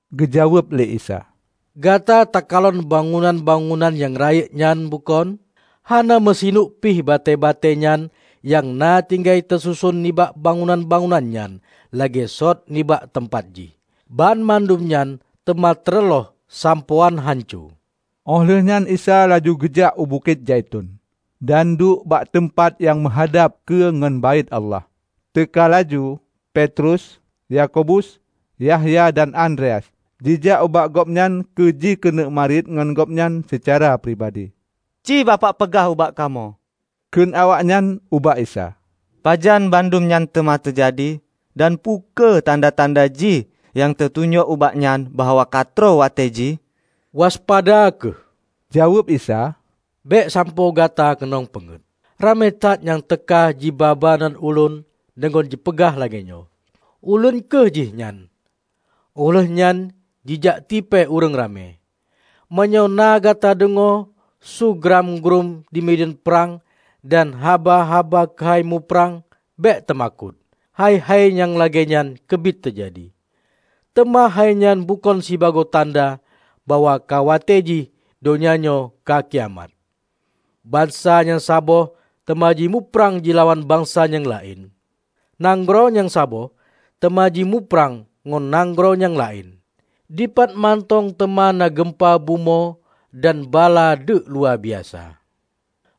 Geujaweueb lé Isa, "Gata takalon bangunan-bangunan nyang rayeuk nyan, bukon? Hana meusineuk pih batée-batée nyan nyang na tinggai teususon nibak bangunan-bangunan nyan lagée sot nibak teumpat jih. Banmandum nyan teuma teureuloh sampoe án hanco." Óh lheueh nyan Isa laju geujak u Bukét Zaiton, dan duek bak teumpat nyang meuhadab keue ngon Baét Allah. Teuka laju Petrus, Yakobus, Yahya dan Andreas jijak ubak Gobnyan keu jikeuneuk marit ngon Gobnyan seucara pribadi. "Ci Bapak peugah ubak kamoe," kheun awaknyan ubak Isa, "pajan bandum nyan teuma teujadi? Dan peu kheueh tanda-tanda jih nyang teutunyok ubak nyan bahwa katroh watée jih?" "Waspada kheueh," jaweueb Isa, "bék sampoe gata keunong peungét. Ramé that nyang teuka jiba-ba nan Ulôn deungon jipeugah lagée nyoe, 'Ulôn kheueh jihnyan!' óh lheueh nyan jijak tipée ureuëng ramé. Meunyoe na gata deungoe su grám gruém dimideuen prang dan haba-haba keuhai muprang, bék teumakot. Hai-hai nyang lagée nyan keubiet teujadi, teuma hainyan bukon sibagoe tanda bahwa ka watée jih donya nyoe ka kiamat. Bansa nyang saboh teuma jimuprang jilawan bansa nyang laén. Nanggroe nyang saboh teuma jimuprang ngon nanggroe nyang laén. Dipat mantong teuma na geumpa bumoe dan bala deuek luwa biasa.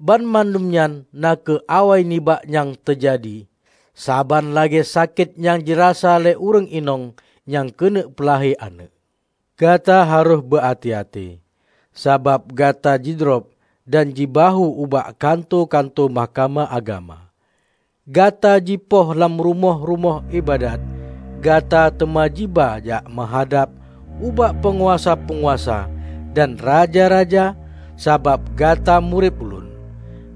Banmandum nyan na kheueh awai nibak nyang teuma teujadi, saban lagée sakét nyang jirasa lé ureuëng inong nyang keuneuk peulahé aneuëk. Gata harôh beu até-até, sabab gata jidrob dan jibahue ubak kantô-kantô mahkamah agama. Gata jipoh lam rumoh-rumoh iébadat. Gata teuma jiba jak meuhadab ubak peunguasa-peunguasa dan raja-raja sabab gata murit Ulôn.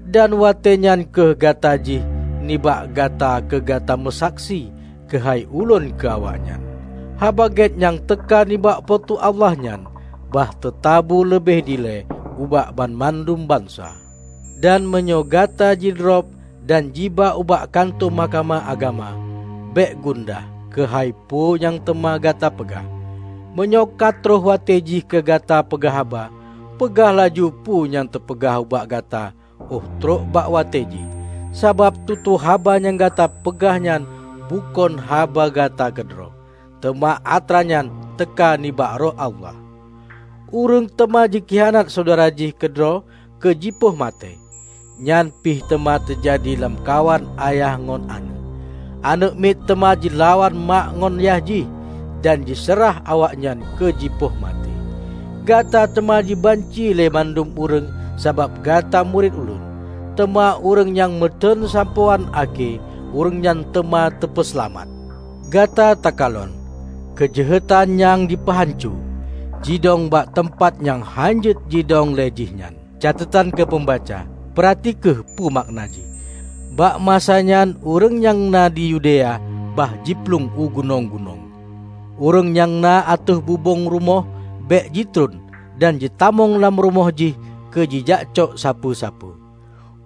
Dan watée nyan kheueh watée jih nibak gata keu gata meusaksi keuhai Ulôn keu awaknyan. Haba Gét nyang teuka nibak Po teu Allah nyan bah teutabu leubeh dilée ubak banmandum bansa. Dan meunyoe gata jidrob dan jiba ubak kantô mahkamah agama, bék gundah keuhai peue nyang teuma gata peugah. Meunyoe ka troh watée jih keu gata peugah haba, peugah laju peue nyang teupeugah ubak gata óh troh bak watée jih. Sabab tutoe haba nyang gata peugah nyan bukon haba gata keudroe, teuma atra nyan teuka nibak Roh Allah. Ureuëng teuma jikhianat syedara jih keudroe keu jipoh maté. Nyan pih teuma teujadi lamkawan ayah ngon aneuëk. Aneuëk miet teuma jilawan mak ngon yah jih, dan jiseurah awaknyan keu jipoh maté. Gata teuma jibanci lé mandum ureuëng sabab gata murit Ulôn. Teuma ureuëng nyang meuteuen sampoe án akhé, ureuëng nyan teuma teupeuseulamat." "Gata takalon 'Keujeuhetan nyang Jipeuhanco' jidong bak teumpat nyang hán jeuet jidong le jih nyan. (Catetan keu peumbaca: peurati kheueh peue makna jih!) Bak masanyan ureuëng nyang na di Yudea bah jiplueng u gunong-gunong. Ureuëng nyang na ateueh bubong rumoh bék jitron dan jitamong lam rumoh jih keu jijakcok sapeue-sapeue.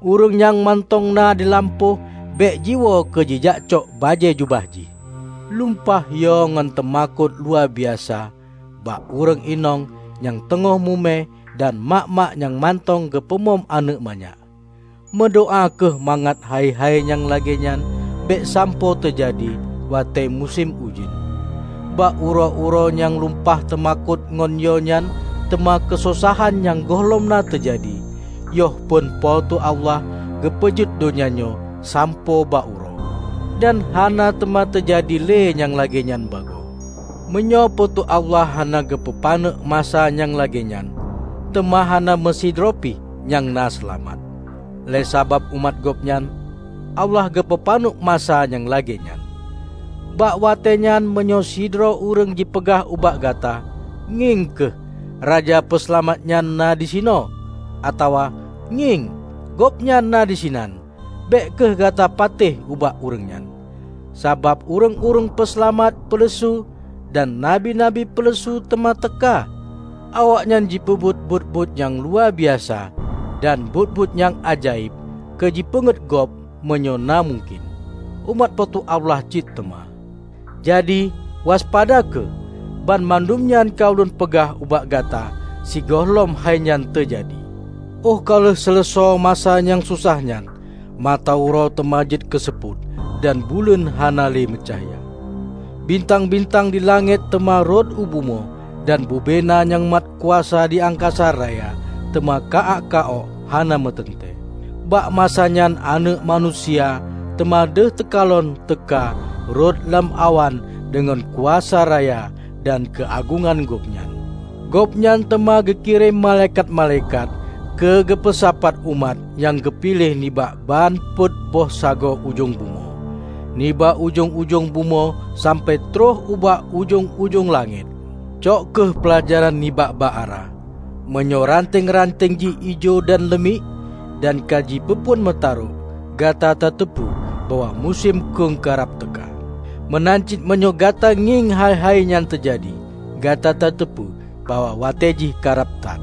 Ureuëng nyang mantong na di lampôh bék jiwoe keu jijakcok bajée jubah jih. Lumpah yo ngon teumakot luwabiasa bak ureuëng inong nyang teungoh mume dan mak-mak nyang mantong geupeumom aneuëk manyak! Meudoá kheueh mangat hai-hai nyang lagée nyan bék sampoe teujadi watée musém ujeuen. Bak uroe-uroe nyang lumpah teumakot ngon yo nyan teuma keusosahan nyang gohlom na teujadi, yoh phon Po teu Allah geupeujeuet donya nyoe sampoe bak uroe, dan hana teuma teujadi lé nyang lagée nyan bagoe. Meunyoe Po teu Allah hana geupeupaneuk masa nyang lagée nyan, teuma hana meusidroe pih nyang na seulamat. Lé sabab umat Gobnyan, Allah geupeupaneuk masa nyang lagée nyan. Bak watée nyan meunyoe sidroe ureuëng jipeugah ubak gata, 'Ngieng kheueh, Raja Peuseulamat nyan na disinoe!' atawa, 'Ngieng, Gobnyan na disinan!' -- bék kheueh gata patéh ubak ureuëng nyan. Sabab ureuëng-ureuëng peuseulamat peuleusu dan nabi-nabi peuleusu teuma teuka. Awaknyan jipeubuet buet-buet nyang luwa biasa dan buet-buet nyang ajaéb keu jipeungét gob meunyoe na mungken, umat Po teu Allah cit teuma. Jadi, waspada kheueh! Banmandum nyan ka ulôn peugah ubak gata sigohlom hainyan teujadi." "Óh ka lheueh leuseusoe masa nyang sosah nyan, mata uroe teuma jeuet keuseupôt, dan buleuen hana le meucahya. Bintang-bintang di langét teuma rhot u bumoe, dan bubena nyang mat kuasa di angkasa raya teuma ka-ák ka-ok hana meuteuntée. Bak masa nyan Aneuëk Manusia teuma deuh teukalon teuka rot lam awan deungon kuasa raya dan keuagongan gobnyan. Gobnyan teuma geukirém malaikat-malaikat keu geupeusapat umat nyang geupiléh nibak ban peuet boh sagoe ujong bumoe, nibak ujong-ujong bumoe sampoe troh ubak ujong-ujong langét." "Cok kheueh peulajaran nibak bak ara. Meunyoe ranteng-ranteng jih ijo dan leumiek, dan ka jipeuphon meutarôk, gata tateupeue bahwa musém khueng ka rab teuka. Meunan cit meunyoe gata ngieng hai-hai nyan teujadi, gata tateupeue bahwa watée jih ka rab that.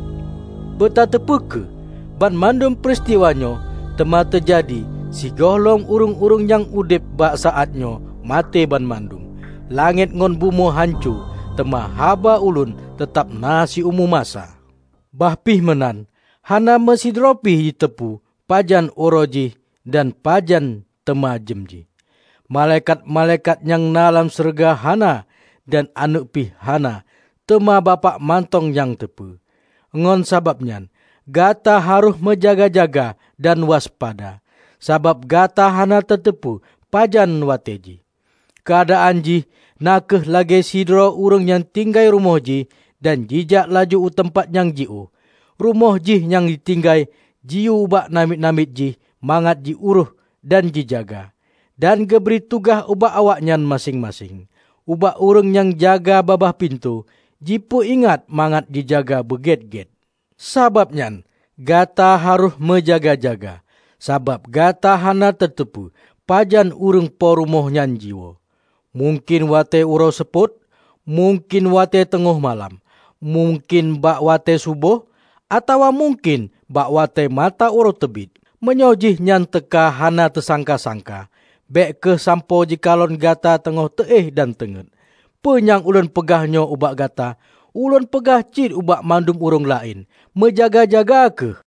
Beutateupeue kheueh! Banmandum peuristiwa nyoe teuma teujadi sigohlom ureuëng-ureuëng nyang udeb bak saát nyoe maté banmandum. Langét ngon bumoe hanco, teuma haba ulôn teutab na siumu masa." "Bah pih meunan, hana meusidroe pih jiteupeu pajan uroe jih dan pajan teuma jeuem jih. Malaikat-malaikat nyang na lam syeuruga hana, dan Aneuëk pih hana, teuma Bapak mantong nyang teupeue. Ngon sabab nyan, gata harôh meujaga-jaga dan waspada, sabab gata hana tateupeue pajan watée jih. Keuadaan jih na kheueh lagée sidroe ureuëng nyang tinggai rumoh jih dan jijak laju u teumpat nyang jiôh. Rumoh jih nyang jitinggai jiyue ubak namiet-namiet jih mangat ji urôh dan jijaga, dan geubri tugaih ubak awaknyan maséng-maséng. Ubak ureuëng nyang jaga babah pintoe, jipeu ingat mangat jijaga beugét-gét. Sabab nyan, gata harôh meujaga-jaga, sabab gata hana tateupeue pajan ureuëng po rumoh nyan jiwoe -- mungken watée uroe seupôt, mungken watée teungoh malam, mungken bak watée suboh, atawa mungken bak watée mata uroe teubiet. Meunyoe jihnyan teuka hana teusangka-sangka, bék kheueh sampoe jikalon gata teungoh teu éh dan teungét. Peue nyang ulôn peugah nyoe ubak gata, ulôn peugah cit ubak mandum ureuëng laén: meujaga-jaga kheueh!"